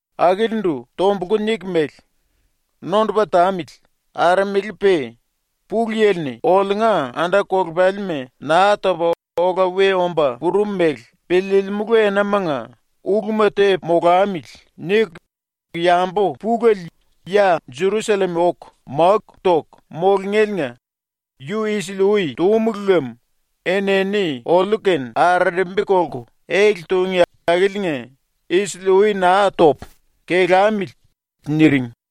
Akilindu tombulku niku mele: “⸤Nondupa tamili,⸥ aramele-pe Pulu Yili-ni oliunga anda-kolepalima Naa Topa Ola We Omba Purum Mele ⸤Piliilimulu⸥ Enamanga ⸤‘uluma tepu molamili.’ niku⸥ yambu pulele ya Jerusallem oku máku toku mulungéliinga yu isili-ui túmulu lem enini oliu-kene arerembi kolku ele tungí akiliinga isili-ui naa topu, kelamili.” niring.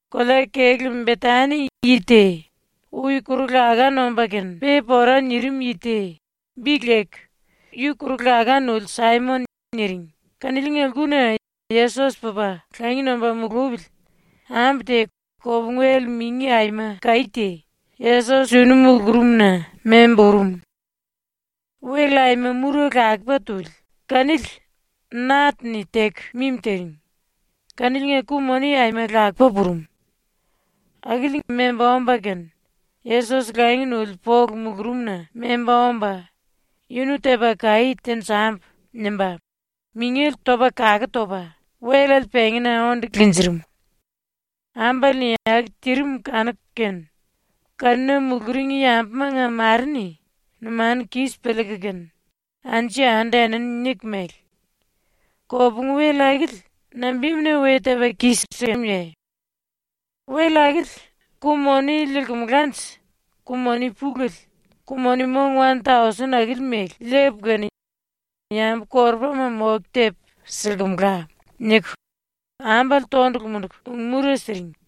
Kolea-kelú Betani yi te ⸤ui kuru-laká nomba kene pe pora nirim yi te,⸥ bi leku “Yi Kuru-Laká Nuli Saimon” niring kaniliinga lkuna Yesos pupa langi nomba mulupili ambu te kopungu-wel mingi aima kaí te Yesos yunu mulurumna memba urum. Wel aima mura lakupa tuli, kanili nat-ni teku mimi tiring, kaniliinga ku-moni aima lakupa purum. Akili memba omba kene Yesos langi nuli polu mulurumna memba omba ⸤‘Yunu tepu kaí tenjambu.’ nimba⸥ mingele topa kaku topa wellale pengína onde linjirim. Ambale-ni aku tirim kanuku kene kanuna muluring yambumanga mare-ni numanu kis piliiku kene anju-yandu enini niku mele: “Kopungu-wel akili nambimuna we tepa kis-sikemuye? Wel akili ku-moni liilkumulanje ku-moni pulele, ku-moni mong wan-tausen akili mele, liipu kene yambu-korupama moke tepu silkumula.” niku ambale tondulu munduku ung-mura siring.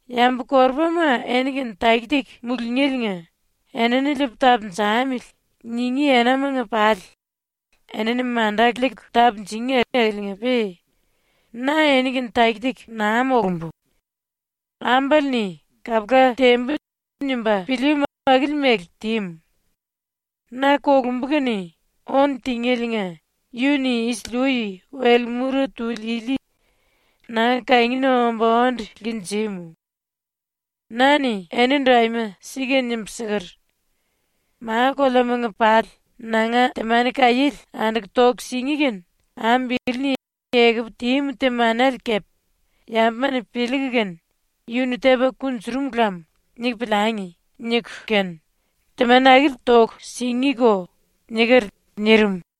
Yambu-korupama eni-kene taki-taki mulungéliinga ‘Enini liipu tapunjamili.’ ningí enamanga pali enini manda liiku tapunjungí akiliinga-pe na eni-kene taki-taki naa molumbu. Ambale-ni ‘Kapula tembu.’ nimba pilíímu akili mele tímu. Na ⸤kolumbu kene⸥ ónu tingéliinga yu-ni isili-ui wel mura tuli ili nanga kangina omba onde linjímu. Na-ni enindu aima sika nimbu siker: “Ma-koleamanga pali ⸤nanga⸥ temani kaiéle anduku toku singí kene ambu ili-ni ekupu tímu temanele kepe ‘Yambuma-ni piliiku kene ‘Yu-ni tepa kunjurum lam.’ niku piliangi.’ niku kene temani akili toku singíko.” niker.” nirim.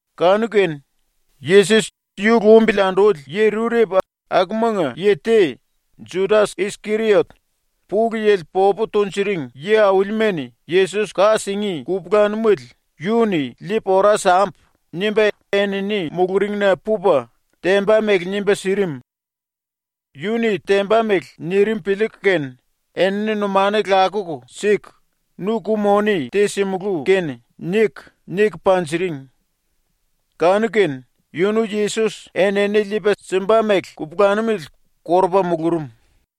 Kanu-kene ⸤Yesos yu lumbili anduli⸥ yi rurepu akumanga yi te, Judas-Iskeriot, ‘Pulu Yili popu tunjuring yi-aulima-ni Yesos ka singí kupulanumele yu-ni liipu ora sambu.’ nimba enini muluringna pupa, temba mele nimba sirim. Yu-ni temba mele nirim piliiku kene enini numanu lakuku siku “Nu ku-moni te simulú kene.” niku, niku panjiring. Kanu-kene yunu Yesos enini liipa simba mele kupulanumele korupa mulurum.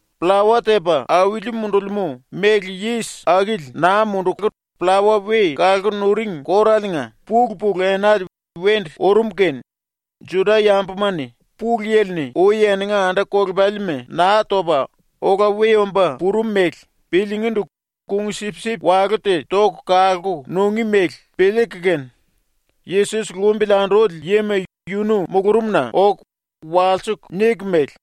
Pllawa Tepa Auli Mundulimú Méle Yis Akili Naa Munduku Pllawa We Kalku Nuring Kóraliinga pulu-pulu enale wendu urum kene Juda-yambuma-ni Pulu Yili-ni ui eninga anda-kolepalima Naa Topa Ola We Omba Purum mele piliingíndu kung-sipsip walú te toku kalku nungí mele piliiku kene, Yesos lumbili anduli yima yunu mulurumna oku walsiku niku mele: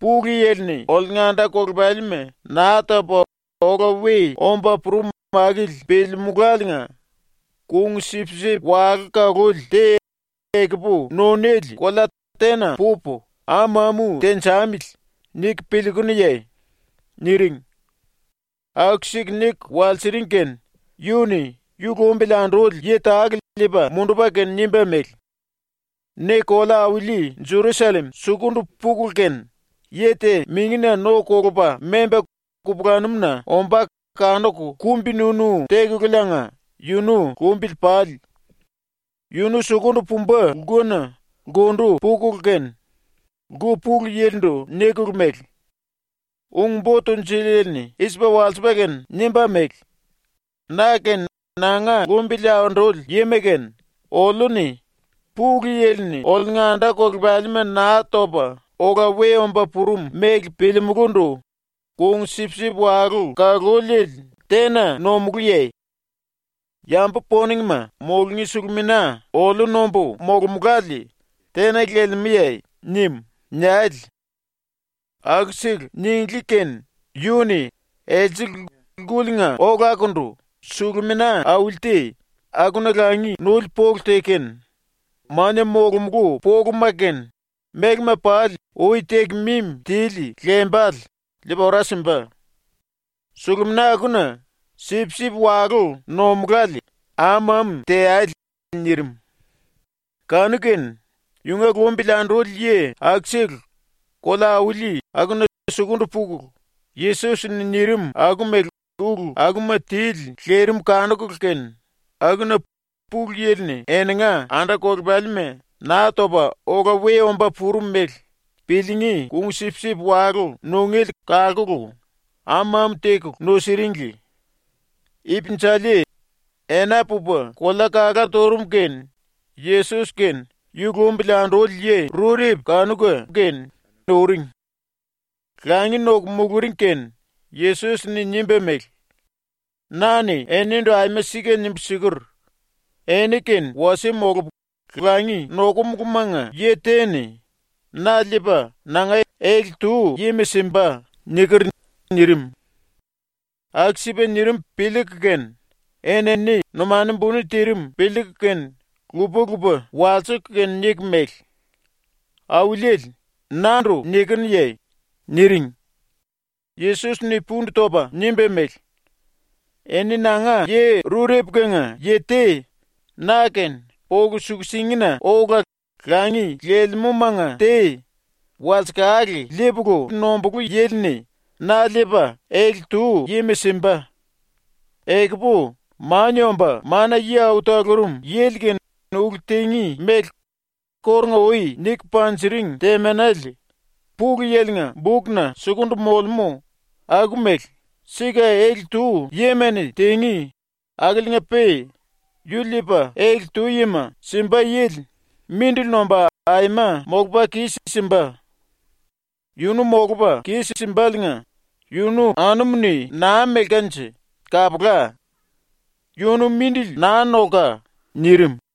“Pulu Yili-ni oliunga anda-kolepalima Naa Topa Ola We Omba Purum akili piliimuláliinga kung-sipsip walú ⸤kaluli⸥ te ekupu nunéle kolea tena pupu am-amu tenjamili niku piliikunuye?” niring. Aku-siku niku walsiring kene yu-ni yu lumbili anduli yi tale liipa mundupa kene nimba mele: “Ne kolea-auli ⸤Jerusallem⸥ sukundu pukulu kene, yi te mingina no kolupa memba kupulanumuna ombá kanuku kumbi-nunu tekululiinga yunu lumbili pale. Yunu sukundu pumba lkuna ⸤lkundu pukulu kene⸥, lku pulu yilindu nikulu mele: “Ung-Bo Tunjuliele-ni i-sipa walsipa kene nimba mele: “Na kene nanga lumbili anduli yima kene oliu-ni Pulu Yili-ni oliunga anda-kolepalima Naa Topa Ola We Omba Purum mele piliimulúndu kung-sipsip walú ⸤kaluliele⸥ tena nomulúye? Yambu poningma mulungí sulumina oliu nombu molomulále tena lelemúye?” nim.” niale. Aku-siku ninglí kene yu-ni else lkuliinga olakundu sulumina auli te, akuna langi nuli polu te kene, mania molomulú poluma kene, mélema pali ui teku mimi tili lembale, liipa ora simba. Sulumina akuna ⸤sipsip-walú nomulále⸥ am-amu teale.” nirim. Kanu-kene yunga lumbili anduli yi akusele kolea-auli akuna sukundu pukulu, Yesos-ni nirim aku mele ulu akuma tili lirim kanukulu kene, akuna Pulu Yili-ni eninga anda-kolepalima Naa Topa Ola We Omba Purum mele piliingí kung-sipsip walú nungéle kalkulu am-amu tekulu nusiringli. Ipinjali ena pupa kolea kalá turum kene Yesos kene yu lumbili anduli yi rurepu kanuka kene uring. Langi noku muluring kene Yesos-ni nimba mele: “Na-ni enindu aima sika nimbu siker: “Eni kene wasie molupu langi nokumulumanga yi te-ni na liipa nanga ele-tu yima simba.” niker.” nirim. ⸤Aku-sipa nirim piliiku kene⸥ enini numanu buni tirim piliiku kene lupa-lupa walsiku kene niku mele: “Auliele, nandu nikinuye?” niring. Yesos-ni pundu topa nimba mele: “Eni nanga yi rurepu-kenga yi te na-kene polu suku-singina ola langi lelemúmanga te walsekale liipulu nombulú yili-ni na liipa, ele-tu yima simba. Ekupu Mania Omba Mana-Yi Au Talurum Yili-kene ulu tingí mele kórunga-ui niku panjiring temanele ⸤Pulu Yili-nga⸥ bukna sukundu molemú aku mele sika ele-tu yima-ni tingí, akiliinga-pe yu liipa ele-tu yima simba yili mindili nomba aima molupa kis-simba. Yunu molupa kis-simbaliinga yunu anumu-ni naa melkanje kapula. ⸤Yunu mindili naa nolka.⸥” nirim.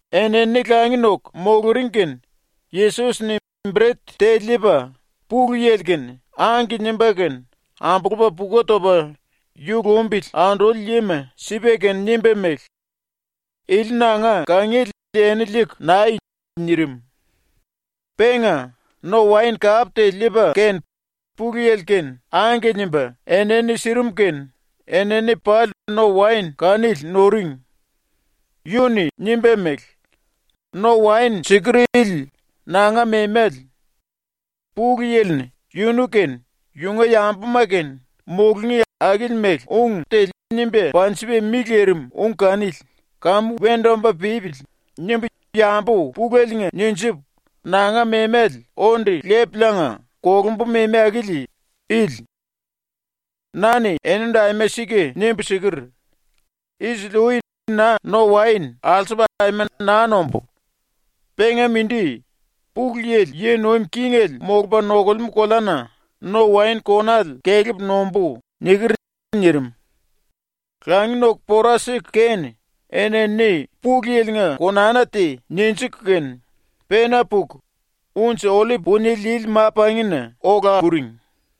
Enini langi noku muluring kene Yesos-ni bret te liipa Pulu Yili-kene “Angke” nimba kene ambulupa puku topa ⸤yu lumbili anduli yima⸥ sipa kene nimba mele: “Ili nanga kangiele eni liiku ⸤nai⸥.” nirim. Penga no-waen kap te liipa kene Pulu Yili-kene “Angke” nimba enini sirim kene enini pali ⸤no-waen kanili⸥ nuring. Yu-ni nimba mele: “⸤No-waen⸥ siker ili nanga memale. Pulu Yili-ni ⸤yunu kene yunga yambuma kene mulungí akili mele⸥ ung te nimba panjipa mi lirim ung kanili ‘Kamu wendu omba pípili.’ nimbu yambu puleliinga ninjipu nanga memale onde lepuliinga ⸤kolumbu⸥ memi akili ili. Na-ni enindu aima sika nimbu siker: “Isili-ui na no-waen alsupu aima naa nombú. Penga mindi, Pulu Yili yi nuim kingele molupa nokulemú koleana no-waen konale kelepu nombú.” niker.” nirim. ⸤Langi noku pora siku kene⸥ enini Pulu Yili-nga konana te ninjiku kene, pena puku Unji-Ollip Punie Lili Ma-Pangina ola puring.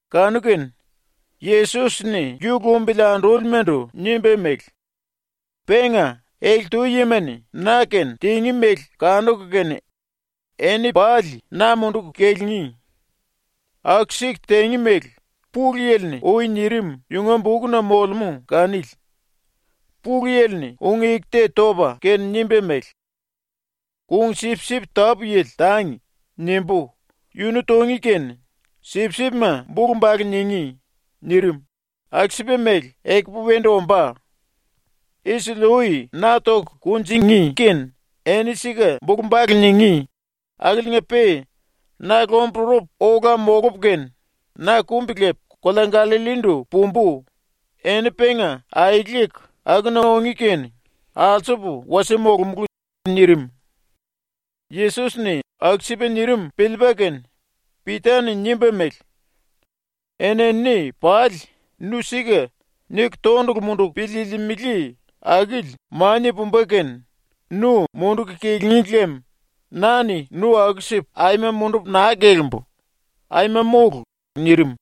Kanu-kene Yesos-ni yu lumbili andúlimandu nimba mele: “Penga ⸤ele-tu yima-ni na-kene tingí mele kanuku kene⸥ eni pali na munduku kilingí. Aku-siku tingí mele Pulu Yili-ni ui nirim yunga bukna molemú kanili. Pulu Yili-ni ⸤ung-eku te topa kene⸥ nimba mele: “ “Kung-sipsip tápu-yili tangi.” nimbú, yunu tungí kene sipsipma bulu-bale ningí.” nirim, ⸤aku-sipa mele ekupu wendu ombá⸥. ⸤Isili-ui na toku kunjingí kene eni sika bulu-bale ningí⸥ akiliinga-pe na lomburupu ola molupu kene, na kumbi lepu kolea Gallallindu pumbu, eni penga aeleku akuna ungí kene ⸤alsupu wasie molomulú⸥.” nirim. ⸤Yesos-ni aku-sipa nirim piliipa kene⸥ Pita-ni nimba mele: “Enini pali ‘Nu sika’ niku tondulu munduku piliilimili akili mania pumba kene nu munduku kilíngi lem na-ni nu aku-sipu aima mundupu naa kelimbu, aima mólu.” nirim.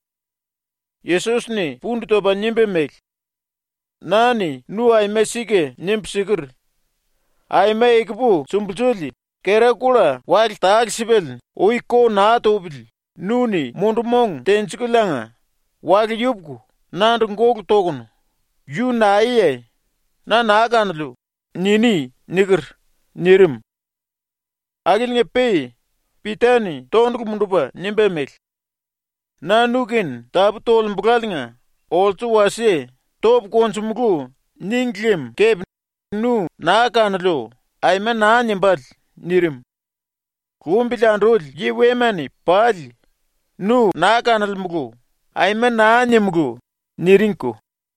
Yesos-ni pundu topa nimba mele: “Na-ni nu aima sika nimbu siker: “Aima ekupu sumbulsuli, kera kulla wale tale-sipale ui ko naa tupili nu-ni mundu-mong tenjikuliinga wale yupuku nandu gólu tokunu “Yu naeye? Na naa kanoliu.” niní.” niker.” nirim. Akiliinga-pe Pita-ni tondulu mundupa nimba mele: “Na nu-kene tapú tolembulaliinga olsu wasie “Topu konjumulú.” níngi lem kepe nu “Naa kanoliu.” aima naa nimbále.” nirim. Lumbili anduli yi wema-ni pali “ “Nu naa kanolemulu.” aima naa nimulú.” niringko.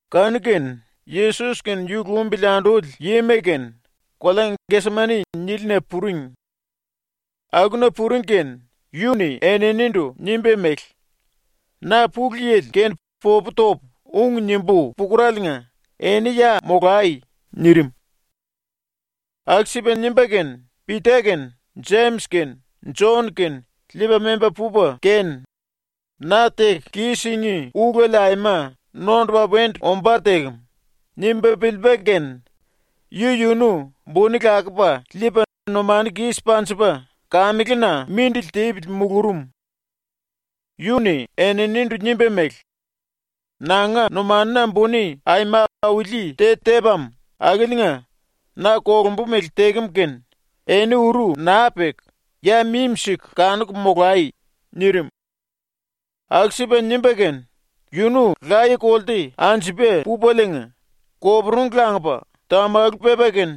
⸤Kanu-kene⸥ Yesos kene yu lumbili anduli yima kene kolea “Gesemani” nílina puring. Akuna puring kene yu-ni eninindu nimba mele: “Na Pulu Yili kene popu topu ung nimbú pukuraliinga eni ya molai.” nirim. Aku-sipa nimba kene Pita kene Jemis kene Jon kene liipa memba pupa kene ⸤‘Na teku kis-singí ulele aima nondupa wendu ombá tekem.’ nimba piliipa kene⸥ yu-yunu buni lakupa liipa numanu kis panjipa kamelena mindili tipili mulurum. Yu-ni eninindu nimba mele: “Nanga numanuna buni aima auli te tepam akiliinga na kolumbu mele tekem ⸤kene⸥ eni uru naa peku, ya mimi-siku kanuku molai.” nirim. Aku-sipa nimba kene yunu laye-kolte anjupa pupaliinga koporungu langupa tamalu pepa kene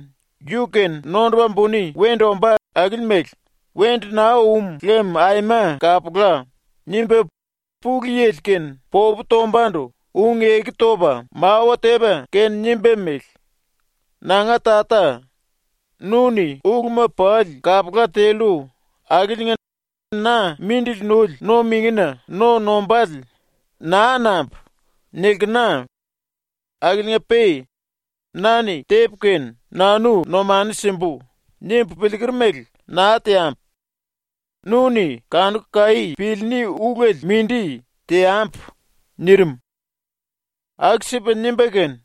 yu-kene nondupa buni wendu ombá akili mele ‘Wendu naa um lem aima kapula.’ nimba Pulu Yili-kene popu tombandu ⸤ung-eku topa⸥ mawa tepa kene nimba mele: “Nanga Tata, nu-ni uluma pali kapula tellu akiliinga na mindili nuli no-mingina no nombále ‘Naa nambu.’ nilkena. Akiliinga-pe ‘Na-ni tepu kene nanu numanu simbu.’ nimbu piliiker mele naa teambu. Nu-ni kanuku kaí piliiní ulele mindi teambu.” nirim. Aku-sipa nimba kene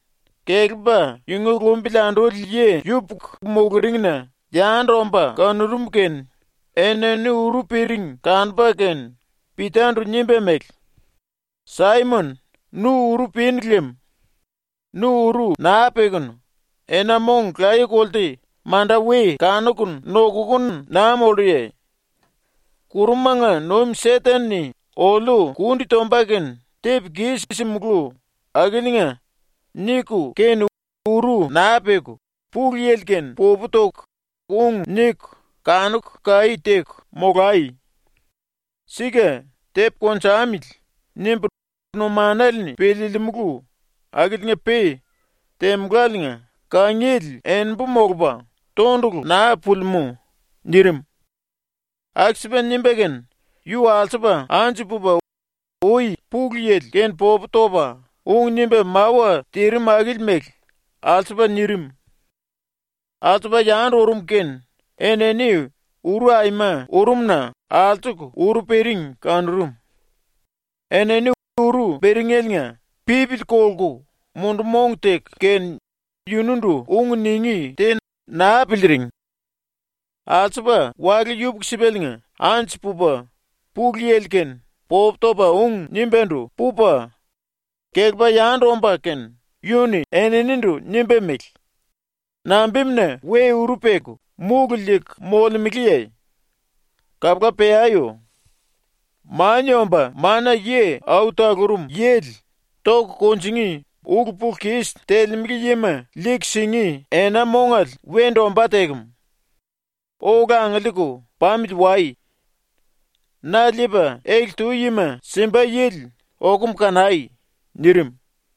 kelepa yunga lumbili anduli yi yupuku muluringna yandu omba kanurum kene enini uru piring kanupa kene Pita-ndu nimba mele: “Saimon, nu uru pinu lem. Nu uru naa pekunu ena-mong laye-kolte manda we kanukunu nokukunu naa molluye? ‘⸤Kurumanga nuim Seten-ni⸥ oliu kundi tomba kene tepu kis-simulú akiliinga.’ niku kene ⸤uru naa peku⸥ Pulu Yili-kene popu toku ung niku kanuku kaí teku molai. Sika ‘tepu konjamili.’ nimbu numanale-ni piliilimulu akiliinga-pe temuláliinga kangiele enimbu molupa tondulu naa pulimú.” nirim. Aku-sipa nimba kene yu alsupa anju pupa ui Pulu Yili-kene popu topa ung nimba mawa tirim akili mele alsupa nirim. Alsupa yandu urum kene enini uru aima urum-na alsuku uru piring kanurum. Enini uru piringeliinga pipili kolku mundu-mong teku kene yunundu ung ningí te naa piliiring. ⸤Alsupa⸥ wale yupuku-sipaliinga ⸤anju pupa Pulu Yili-kene popu topa ung nimbándu pupa⸥ kelepa yandu omba kene yu-ni eninindu nimba mele: “Nambimuna we uru peku múlu liiku molemeleye? Kapula peayo! Mania Omba Mana-Yi Au Talurum Yili ⸤toku kunjingí⸥ ulu-pulu-kis telemele yima liiku singí ena-mongale wendu ombá tekem. Ola angiliiku pamili wai! Na liipa ele-tu yima simba yili okum kanai!” nirim.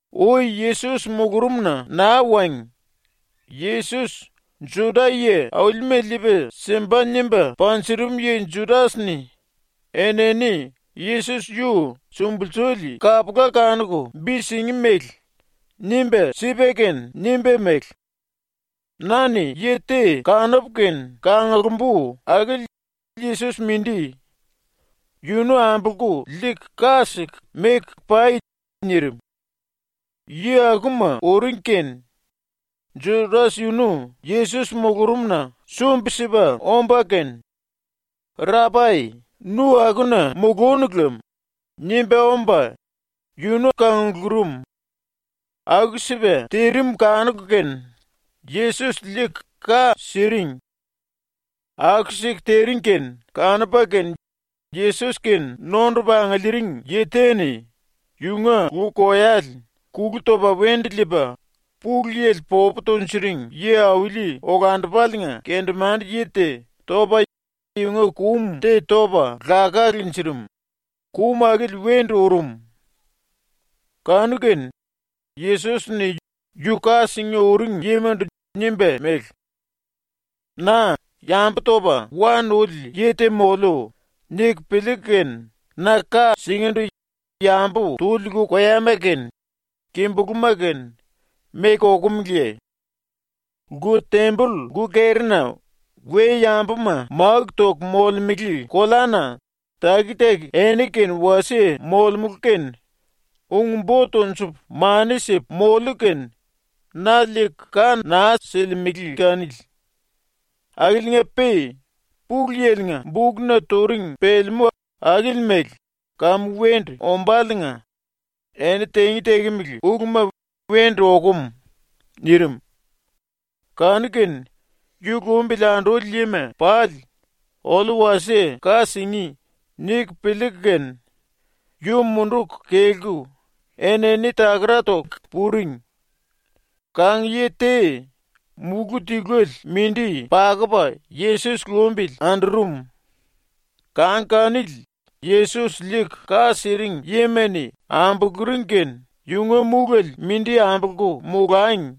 Ui Yesos mulurumna naa wangi Yesos Juda-yi aulima liipa simba nimba panjurum yi ⸤Judas-ni⸥ enini Yesos yu sumbulsuli kapula kanuku bi singí mele nimba sipa kene nimba mele: “Na-ni yi te kanupu kene kanglumbu akili Yesos mindi. Yunu ambolku liiku ka siku meku pai.” nirim. ⸤Yi akuma⸥ uring kene ⸤Judas⸥ yunu Yesos mulurumna sumbi-sipa omba kene “Rapai, nu akuna mulúnu lem.” nimba omba yunu kanglurum. Aku-sipa tirim kanuku kene Yesos liiku ka siring. Aku-siku tiring kene kanupa kene ⸤Yesos-kene⸥ nondupa angiliiring yi te-ni yunga lu-koyale kulu topa wendu liipa Pulu Yili popu tunjuring yi-auli olandupaliinga kendemande-yi te topa yunga kum te topa laká linjirim, kum akili wendu urum. Kanu-kene Yesos-ni ⸤yu ka singí uring⸥ yimandu nimba mele: “Na ‘yambu topa wa nuli yi te moliu.’ niku piliiku kene na ka singíndu yambu tuli lu-koyama kene kimbulúma kene meku okumeleye? Lku-temboll ⸤lku-kerina we-yambuma máku toku molemele⸥ koleana taki-taki eni-kene wasie molemulu kene ung-bo tonjupu mani sipu moliu kene na liiku ka naa silimele kanili. Akiliinga-pe ⸤Pulu Yili-nga⸥ bukna turing pelemú akili mele kamu wendu ombáliinga eni tingí tekemele uluma wendu okum.” nirim. Kanu-kene yu lumbili anduli yima pali ⸤‘Oliu wasie ka singí.’ niku piliiku kene⸥ yu munduku kelku enini takara toku puring. Kang-yi te múlu tiluele mindi pakupa Yesos lumbili andurum. Kang kanili ⸤Yesos liiku ka siring yima-ni⸥ ambuluring kene yunga múlele ⸤mindi⸥ ambolku molangi,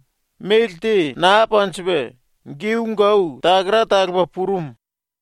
méle te naa panjipa giu-gau takara talupa purum.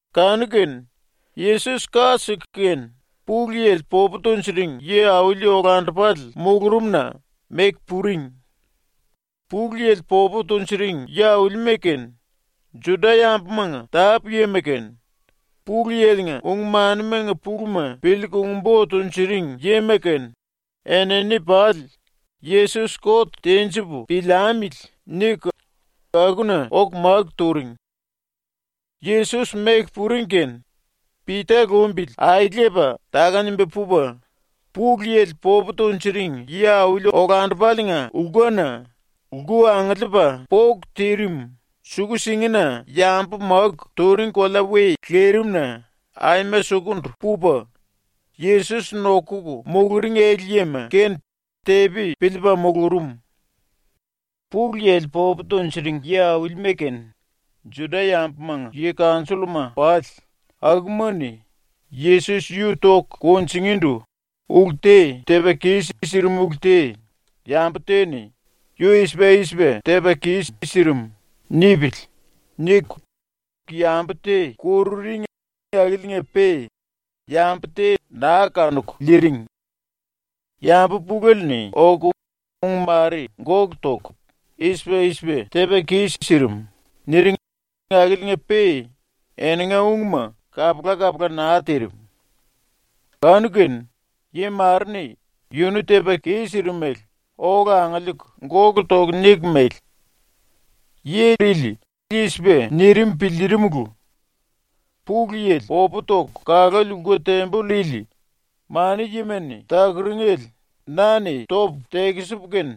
Kanu-kene Yesos ⸤ka siku kene⸥ Pulu Yili popu tunjuring yi-auli olandupale mulurumna meku puring. Pulu Yili popu tunjuring yi-aulima kene, Juda-yambumanga tápu-yima kene, ⸤Pulu Yili-nga⸥ ung-manimanga puluma piliiku ung-bo tunjuring yima kene, enini pali ⸤‘Yesos kot tenjipu piliamili.’ niku⸥ akuna oku máku turing. Yesos ⸤meku puring⸥ kene Pita lumbili aelepa táka-nimba pupa, Pulu Yili popu tunjuring yi-auli olandupaliinga lkuna, lku angiliipa póku tirim, suku-singina yambu máku turing kolea we lirimna aima sukundu pupa, ⸤Yesos nokuku muluring⸥ ele-yima kene tepi piliipa mulurum. Pulu Yili popu tunjuring yi-aulima kene, Juda-yambumanga yi-kanjolluma pali, akuma-ni Yesos yu toku kunjingíndu ulu te tepa kis-sirim ulu te ‘Yambu te-ni ‘yu i-sipa i-sipa tepa kis-sirim.’ nipili.’ niku yambu te kururing akiliinga-pe yambu te naa kanuku liiring. Yambu pulele-ni oku ung mare gólu toku “I-sipa i-sipa tepa kis-sirim.” niring akiliinga-pe eninga ungma kapula-kapula naa tirim. Kanu-kene yi mare-ni yunu tepa kis-sirim mele ola angiliiku gólu toku niku mele: “Yi ili i-sipa nirim piliirimulu: “⸤Pulu Yili popu toku kaluli⸥ lku-temboll ili, mana-yima-ni takuringele na-ni topu tekisipu kene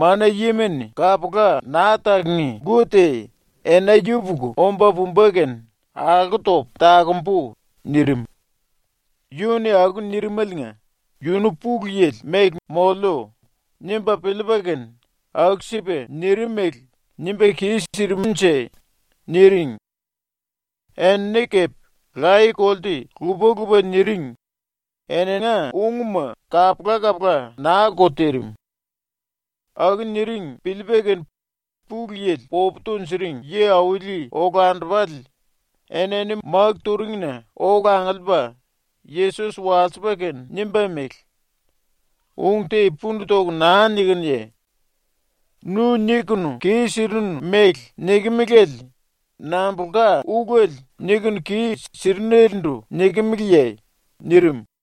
mana-yima-ni kapula naa takungí lku te ena yupuku omba pumba kene alko topu takumbu.” nirim. ⸤Yu-ni aku nirimaliinga ‘Yunu Pulu Yili mele moliu.’ nimba piliipa kene aku-sipa nirimele nimba kis-sirimnje⸥.” niring. Enini kepe laye-kolte lupa-lupa niring, eninga ungma kapula-kapula naa-ko tirim. Aku niring piliipa kene Pulu Yili popu tunjuring yi-auli olandupale enini máku turingina ola angiliipa Yesos walsipa kene nimba mele: “Ung te pundu toku naa nikinuye? Nu nikunu kis-sirinu mele nikimiliele nambulka ulele nikunu kis-sirinelendu nikimeleye?” nirim.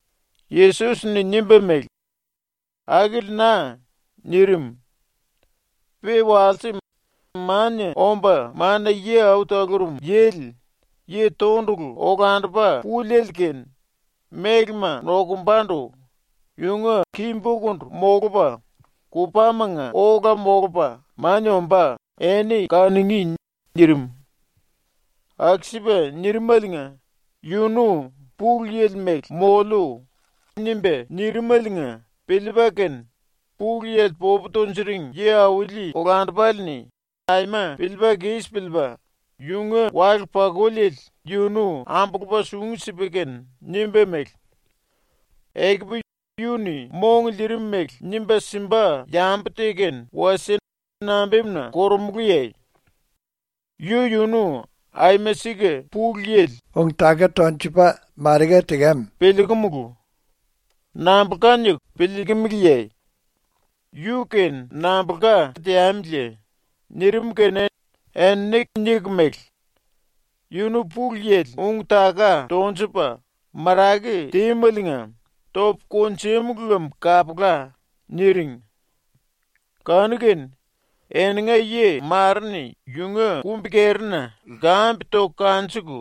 Yesos-ni nimba mele: “Akili na.” nirim. “Pe walse Mania Omba Mana-Yi Au Talurum Yili, Yi Tondulu Olandupa Púliele ⸤kene mélema nokumbandu⸥ yunga ki-bokundu molupa, kupámanga ola molupa mania ombá eni kanungí.” nirim. Aku-sipa nirimaliinga ⸤yunu ‘Pulu Yili mele moliu.’ nimba nirimaliinga⸥ piliipa kene Pulu Yili popu tunjuring yi-auli olandupale-ni ⸤aima piliipa kis piliipa⸥ yunga wale-pakuliele yunu ambulupa sungu sipa kene nimba mele: “Ekupu yu-ni mong liirim mele nimba simba yambu te kene wasie nambimuna korumulúye? Yu-yunu aima sika Pulu Yili ung-taka tonjukum piliikumulu. Nambulka niku piliikimiliye? ⸤Yu-kene nambulka teamiliye?⸥” nirim kene enini niku mele: “Yunu Pulu Yili ung-taka tonjupa marake tímeliinga topu kunjúmulu lem kapula.” niring. Kanu-kene eninga yi mare-ni yunga ⸤kumbi-kerina⸥ lkambe toku kanjuku,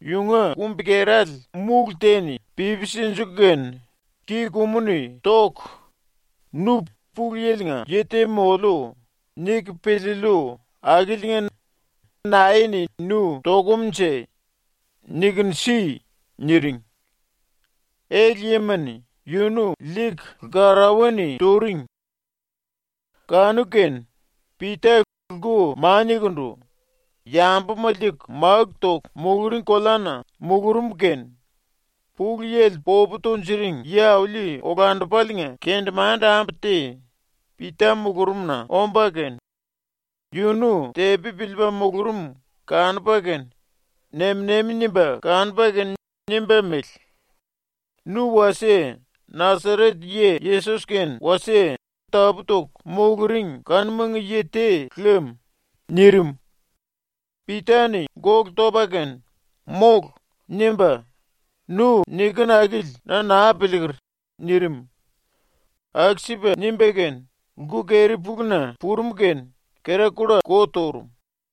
yunga kumbi-kerale múlu te-ni pipi sinjiku kene ki-kumu-ni toku ⸤“Nu ‘Pulu Yili-nga yi te moliu.’ niku piliillu akiliinga⸥ nae-ni nu tokumnje nikunu si!” niring. Ele-yima-ni yunu liiku lkarauwa-ni turing. Kanu-kene Pita lku maniakundu, yambuma liiku máku toku muluring koleana mulurum kene Pulu Yili popu tunjuring yi-auli olandupaliinga kendemande-ambu te Pita mulurumna omba kene yunu tepi piliipa mulurum kanupa kene nem-nemi nimba kanupa kene nimba mele: “Nu wasie Nasaret yi Yesos-kene wasie tapú-toku muluring kanumanga yi te lem.” nirim. Pita-ni gólu topa kene “Mólu!” nimba “Nu nikinu akili na naa piliiker!” nirim. Aku-sipa nimba kene lku-keri-puluna purum kene kera kulla ko turum.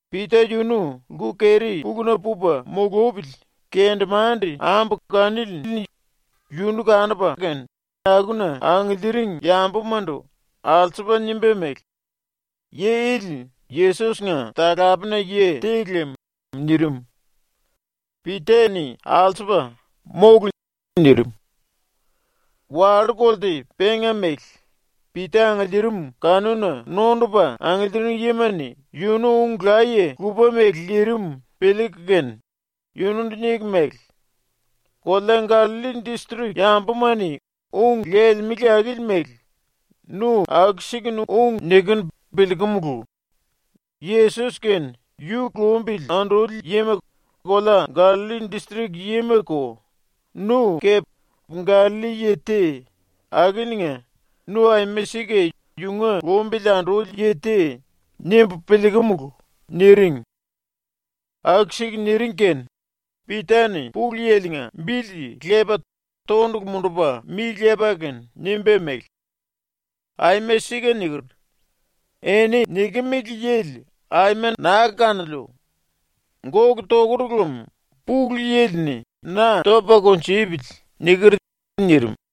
Pita yunu lku-keri-puluna pupa mulupili kendemande-ambu kanili-ni yunu kanupa kene akuna angiliiring yambumandu alsupa nimba mele: “Yi ili Yesos-nga talapena yi te lem.” nirim. Pita-ni alsupa “Mólu!” nirim. Wallú-kolte penga mele Pita angiliirim kanuna nondupa angiliiring yima-ni ⸤yunu ung laye lupa mele lirim piliiku kene⸥ yunundu niku mele: “Kolea Gallalli distrik yambuma-ni ung lelemele akili mele nu aku-sikunu ung nikinu piliikumulu. ⸤Yesos kene yu lumbili anduli yima kolea Gallalli distrik yimako,⸥ nu kepe Gallalli yi te, akiliinga ‘Nu aima sika yunga lumbili anduli yi te.’ nimbu piliikumulu.” niring. Aku-siku niring kene Pita-ni Pulu Yili-nga bili lepa tondulu mundupa mi lepa kene nimba mele: “Aima sika niker. “Eni nikimili yili aima naa kanoliu! Gólu tokur lem Pulu Yili-ni na topa kunjupili.” niker.” nirim.